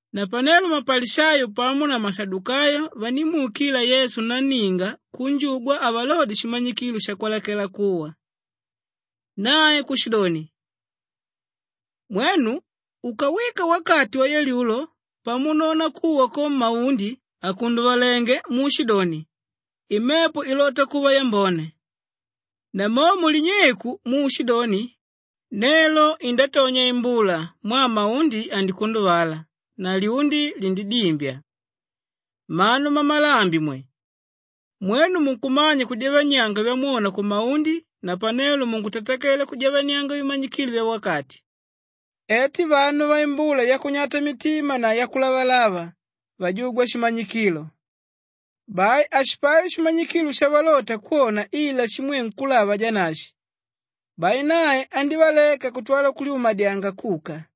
Napanelo mapalishayo pamo na mashadukayo vandímuukila Yesu nanninga kunjugwa avalodye shimanyikilo shakwalakela kuwa. Nae kushidoni, “Mwenu ukawika wakati wayalyulo pamunona kuwa ko maundi akunduvalenge muushidoni, ‘Imepo ilota kuva yambone.’ Namomo linyeiku muushidoni, ‘Nelo indatonya imbula mwaa maundi andikunduvala na lyundi lindidimbya.’ Mmanu mmamalambi mwe! Mwenu munkumanya kujavanianga vyamwona kumaundi napanelo munkutatakela kujavanianga vimanyikilo vyawakati. Eti vanu vaimbula yakunyata mitima na yakulavalava vajugwa shimanyikilo! Bai hashipali shimanyikilo shavalota kwona ila shimwe nkúlava Janashi.” Bai nae andívaleka kutwala kulyumadyanga kuka.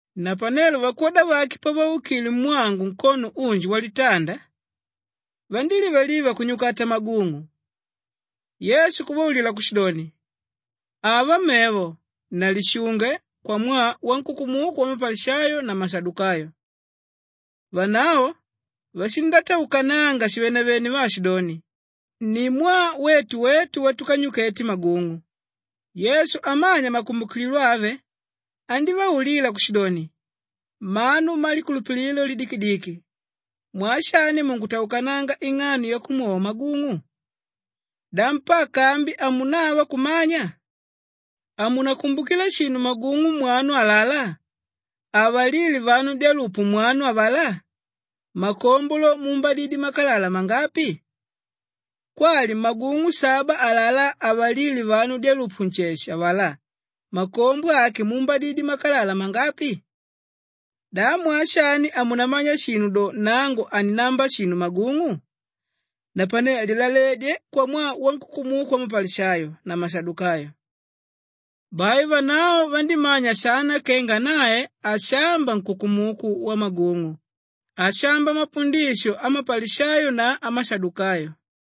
Napanelo vakwoda vake pavaukile mwangu nkono unji walitanda, vandílivaliva kunyukata magung'u. Yesu kuvaulila kushidoni, “Ava mevo na lishunge kwamwaa wankukumuku wamapalishayo na wamashadukayo.” Vanavo vashindataukananga shivenevene vaashidoni, “Ni mwaa wetu wetu watukanyukete magung'u.” Yesu amanya makumbukililo ave andívaulila kushidoni, “Mmanu mmalikulupililo lidikidiki, mwaa shani munkutaukananga ing'ano yakumwova magung'u? Da mpaka ambi hamunava kumanya? Hamunakumbukila shinu magung'u mwanu alalá avalíle vanu dyalupu mwanu avalá? Makombo lo, muumbadidye makalala mangapi? Kwali magung'u saba alalá avalíle vanu dyalupu nsheshe avalá? Makombo ake muumbadidye makalala mangapi? Da mwaa shani hamunamanya shinu do nangu haninamba shinu magung'u? Napane lilaledye kwamwaa wankukumuku wamapalishayo na wamashadukayo.” Bai vanavo vandímanya shana kenga nae hashamba nkukumuku wamagung'u; ashamba mapundisho amapalishayo na amashadukayo.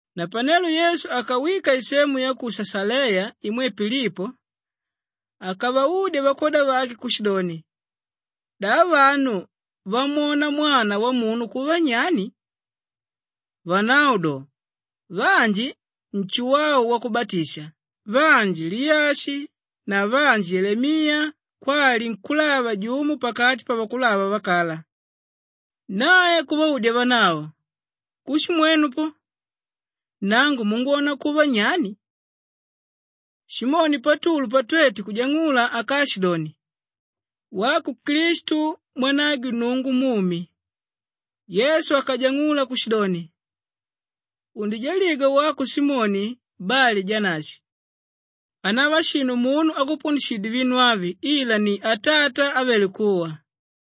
Napanelo Yesu akawika isemu ya ku Shashaleya imwe Pilipo, akavaudya vakwoda vake kushidoni, “Da vanu vamwona Mwana Wamunu kuva nyani?” Vanavo do, “Vanji Nshuwau Wakubatisha, vanji Liyashi na vanji Yelemiya kwali nkúlava jumo pakati pavakulava vakala.” Nae kuvaudya vanavo, “Kushi mwenu po, nangu mungwona kuva nyani?” Simoni Patulu patwete kujang'ula akaashidoni, “Wako Klistu mwanagwe Nnungu mumi.” Yesu akanjang'ula kushidoni, “Undijaligwa wako Simoni Bali-Janashi! Hanava shinu munu ákupundishidye vinu avi ila ni Atata ávele kuwa.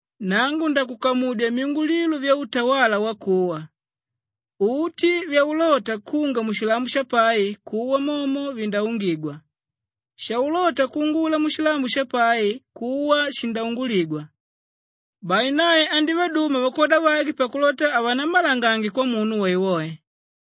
Nangu ndakukamudya myungulilo vyautawala wakuwa; uti vyaulota kunga mushilambo shapai, kuwa momo vindaungigwa, shaulota kuungula mushilambo shapai, kuwa shindaunguligwa.” Bai nae andívaduma vakwoda vake pakulota havanammalangange kwamunu woewoe.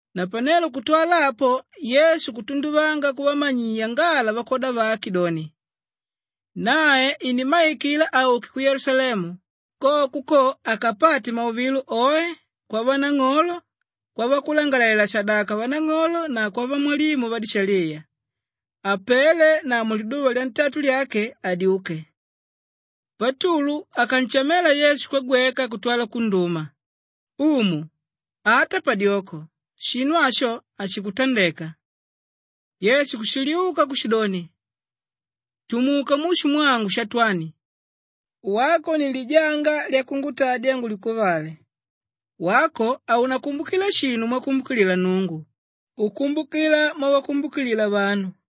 Napanelo kutwala apo Yesu kutunduvanga kuvamanyiya ngala vakwoda vake doni, nae inimmaikila auke ku Yelusalemu, koko ko akapate mauvilo oe kwavanang'olo, kwavakulangalalela-shadaka vanang'olo na kwavamwalimu vadishaliya, apele na muliduva lyantatu lyake adyuke. Patulu akanshamela Yesu kwagweka kutwala kunduma, “Umu, ata padyoko! Shinu asho hashikutandeka.” Yesu kushiliuka kushidoni, “Tumuka mushu mwangu Shatwani! Wako ni lijanga lyakungutadya ngulikuvale. Wako haunakumbukila shinu mwakumbukilila Nnungu, ukumbukila mwavakumbukilila vanu.”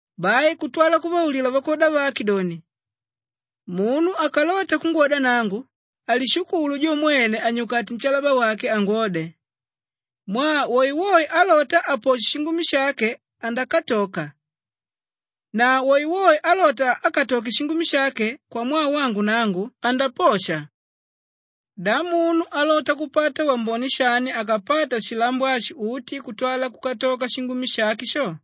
Bai kutwala kuvaulila vakwoda vake doni, “Munu akalota kungwoda nangu, alishukulu jo mwene anyukate nshalaba wake angwode. Mwaa woewoe álota aposhe shingumi shake andakatoka na woewoe álota akatoke shingumi shake kwamwaa wangu nangu, andaposha. Da munu alota kupata wambone shani akapata shilambo ashi uti kutwala kukatoka shingumi shake sho?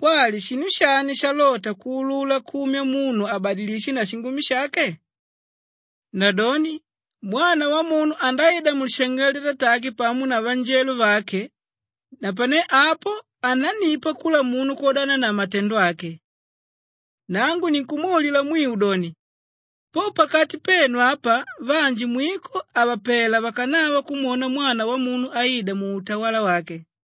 Kwali shinu shani shalota kuulula kumya munu abadilishe na shingumi shake? Nadoni Mwana Wamunu andaida mulishangelo lyatatake pamo na vanjelo vake, napane apo anannipa kula munu kwodana na matendo ake. Nangu ninkumwaulila mwiu doni, po pakati penu apa vanji mwiko havapela vakanava kumwona Mwana Wamunu aida muutawala wake.”